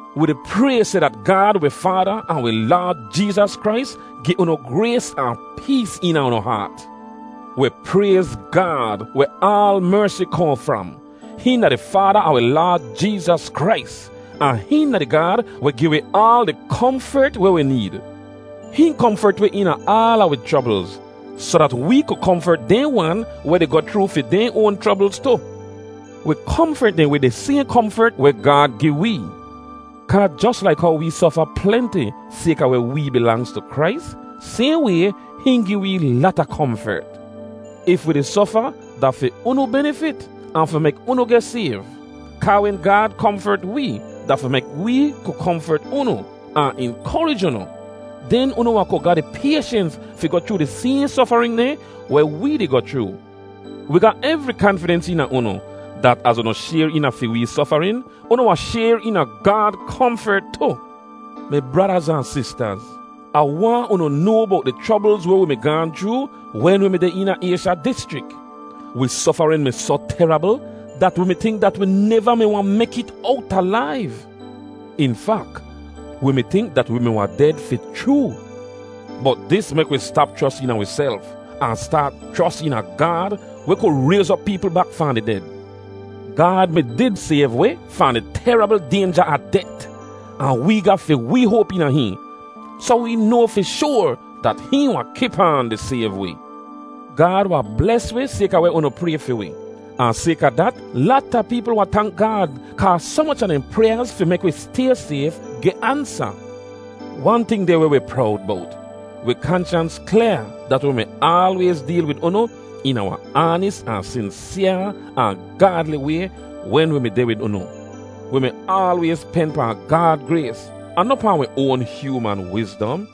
Wi di pray seh dat Gaad wi Faada ahn wi Laad Jeezas Krais gi unu grays ahn pees eena unu haat. Wi prayz Gaad, weh aal mersi kohn fram. Hihn da di Faada a wi Laad Jeezas Krais, ahn hihn da di Gaad weh gi wi aal di komfert weh wi need. Hihn komfert wi eena aala wi chroblz, soh dat wee ku komfert dehn wan weh di goh chroo fi dehn oan chroblz tu. Wi komfert dehn wid di sayhn komfert weh Gaad gi wee. Kaa jos laik how wee sofa plenti sayka weh wee bilangz tu Krais, sayhn way, hihn gi wee lata komfert. If wi di sofa, da fi unu benifit, ahn fi mek unu geh sayv. Kaa wen Gaad komfert wee, da fi mek wee ku komfert unu, ahn inkorij unu. Den unu wahn ku ga di payshens fi goh chroo di sayhn sofarin dehn weh wee di goh chroo. Wi ga evri kanfidens eena unu, dat az unu shayr eena fi wee sofarin, unu wahn shayr eena Gaad komfert tu. Mi bradaz ahn sistaz, Ah waahn unu noa bowt di chroblz weh wi mi gaahn chroo wen wi mi deh eena Aysha dischrik. Wi sofarin mi soh terabl dat wi mi tink dat wi neva mi wahn mek it owt alaiv. In fak, wi mi tink dat wi mi wahn ded fi chroo. Bot dis mek wi stap chros eena wiself, ahn staat chros eena Gaad weh ku rayz op peepl bak fahn di ded. Gaad mi did sayv wi fahn di terabl daynja a det, ahn wee ga fi wee hoap eena hihn, soh wee noa fi shoar dat hihn wahn kip aan di sayv wi. Gaad wahn bles wi sayka weh unu pray fi wi. Ahn sayka dat, lata peepl wahn tank Gaad kaa soh moch a dehn pryaaz fi mek wi stay sayf geh ansa. Wan ting deh weh wi prowd bowt: wi kanshans klyaa dat wi mi aalwayz deel wid unu eena wahn aanis ahn sinsyaa ahn gaadli way wen wi mi deh wid unu. Wi mi aalwayz pen pahn Gaad grays, ahn noh pahn wi oan hyooman wizdom.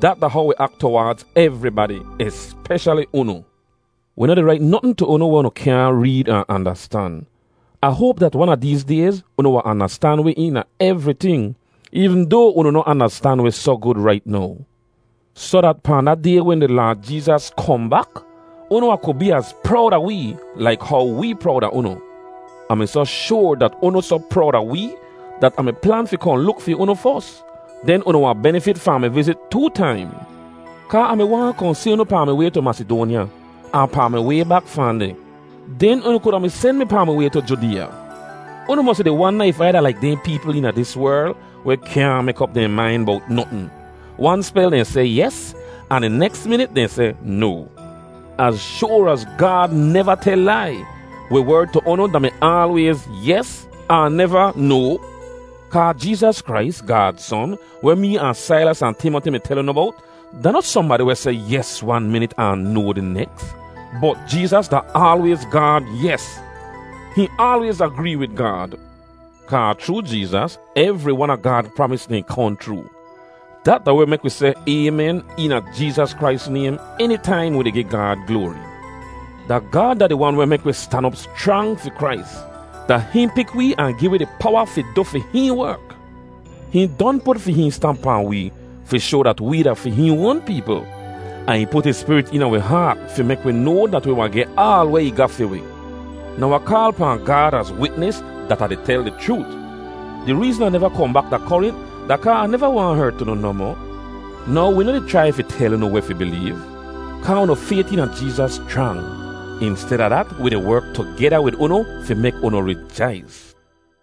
Dat da how wi ak tuwaadz evribadi, espeshali unu. Wi noh di rait notn tu unu weh unu kyaahn reed ahn andastan. Ah hoap dat wan a deez dayz unu wahn andastan wi eena evriting, eevn doa unu noh andastan wi soh gud rait now, soh dat pahn da Day wen di Laad Jeezas kohn bak, unu wahn ku bee az prowd a wee, laik how wee prowd a unu. Ah mi soh shoar dat unu soh prowd a wee, dat Ah mi plan fi kohn luk fi unu fos; den unu wahn benifit fahn mi vizit too taim. Kaa Ah mi waahn kohn si unu pahn mi way tu Masidoanya, ahn pahn mi way bak fahn deh, den unu kuda mi sen mi pahn mi way tu Judeeya. Unu mosi di wanda if Ai da laik dehn peepl eena dis werl weh kyaahn mek op dehn main bowt notn; wan spel dehn seh “Yes” ahn di neks minit dehn seh “No.” Az shoar az Gaad neva tel lai, wi werd tu unu da-mi aalwayz “Yes” ahn neva “No.” Kaa Jeezas Krais, Gaad Son, weh mee ahn Sailas ahn Timoti mi tel unu bowt, da noh sohnbadi weh seh “Yes” wan minit ahn “No” di neks. Bot Jeezas da aalwayz Gaad “Yes.” Hihn aalwayz agree wid Gaad. Kaa chroo Jeezas evri wan a Gaad pramis dehn kohn chroo. Dat da weh mek wi seh “Aymen” eena Jeezas Krais naym enitaim wi di gi Gaad gloari. Da Gaad da di Wan weh mek wi stan op schrang fi Krais; da hihn pik wee ahn gi wi di powa fi du fi hihn werk. Hihn don put fi hihn stamp pahn wee fi shoa dat wee da fi hihn oan peepl. Ahn ih put ih Spirit eena wi haat fi mek wi noa dat wi wahn geh aal weh ih ga fi wi. Now Ah kaal pahn Gaad az witnis dat Ah di tel di chroot! Di reezn Ah neva kohn bak da Korint da kaa Ah neva waahn hert unu nohmoh. Now, wi noh di chrai fi tel unu weh unu fi bileev, kaa unu fayt eena Jeezas schrang. Insteda dat, wi di werk tugeda wid unu fi mek unu rijais.